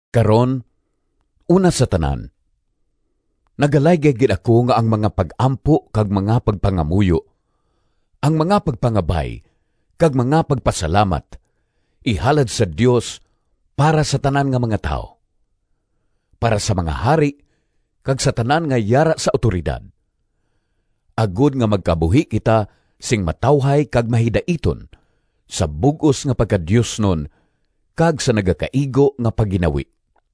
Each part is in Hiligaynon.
Karon, una sa tanan, nagalaygay gid ako nga ang mga pag-ampo kag mga pagpangamuyo, ang mga pagpangabay kag mga pagpasalamat ihalad sa Dios para sa tanan nga mga tawo; para sa mga hari kag sa tanan nga yara sa awtoridad, agod nga magkabuhi kita sing matawhay kag mahidaiton sa bug-os nga pagkadiosnon kag sa nagakaigo nga pagginawi.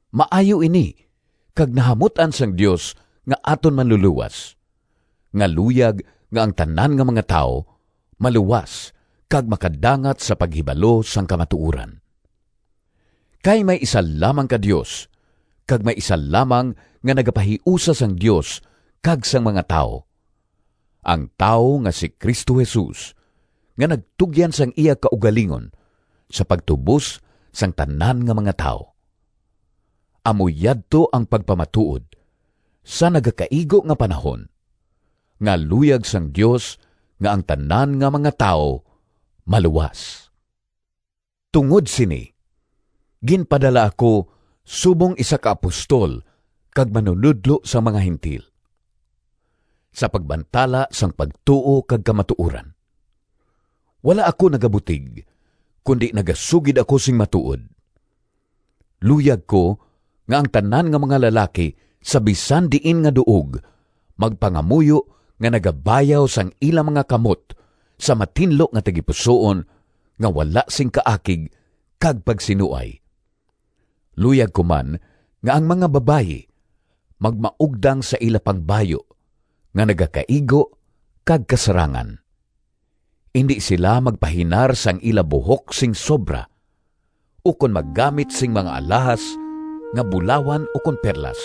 Maayo ini kag nahamut-an sang Dios nga aton Manlulowas, nga luyag nga ang tanan nga mga tawo maluwas kag makadangat sa paghibalo sang kamatuoran. Kay may isa lamang ka Dios kag may isa lamang nga nagapahiusa sang Dios kag sang mga tawo, ang tawo nga si Cristo Jesus, nga nagtugyan sang iya kaugalingon sa pagtubos sang tanan nga mga tawo. Amo yadto ang pagpamatuod, sa nagakaigo nga panahon, nga luyag sang Dios nga ang tanan nga mga tawo maluwas. Tungod sini, ginpadala ako subong isa ka apostol kag manunodlo sang mga Gentil, sa pagbantala sang pagtuo kag kamatuoran. Wala ako nagabutig, kundi nagasugid ako sing matuod! Luyag ko nga ang tanan nga mga lalaki sa bisan diin nga duog magpangamuyo nga nagabayaw sang ila mga kamot sa matinlo nga tagipusoon nga wala sing kaakig kag pagsinuay. Luyag ko man nga ang mga babayi magmaugdang sa ila pangbayu nga nagakaigo kag kasarangan. Indi sila magpahinar sang ila buhok sing sobra, ukon maggamit sing mga alahas nga bulawan ukon perlas,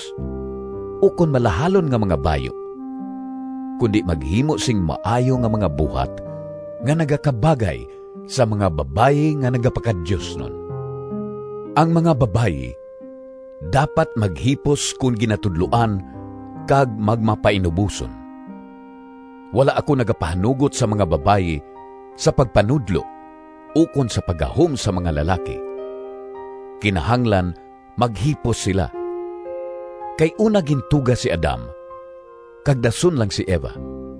ukon malahalon nga mga bayu, kundi maghimo sing maayo nga mga buhat nga nagakabagay sa mga babayi nga nagapakadiosnon. Ang mga babayi dapat maghipos kon ginatudloan kag magmapainuboson. Wala ako nagapahanugot sa mga babayi sa pagpanudlo ukon sa paggahom sa mga lalaki. Kinahanglan maghipos sila. Kay una gintuga si Adam, kag dason lang si Eva.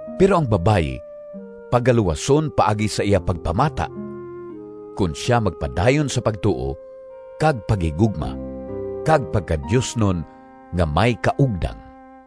Pero ang babayi pagaluwason paagi sa iya pagpamata, kon sia magpadayon sa pagtuo kag paghigugma kag pagkadiosnon nga may kaugdang.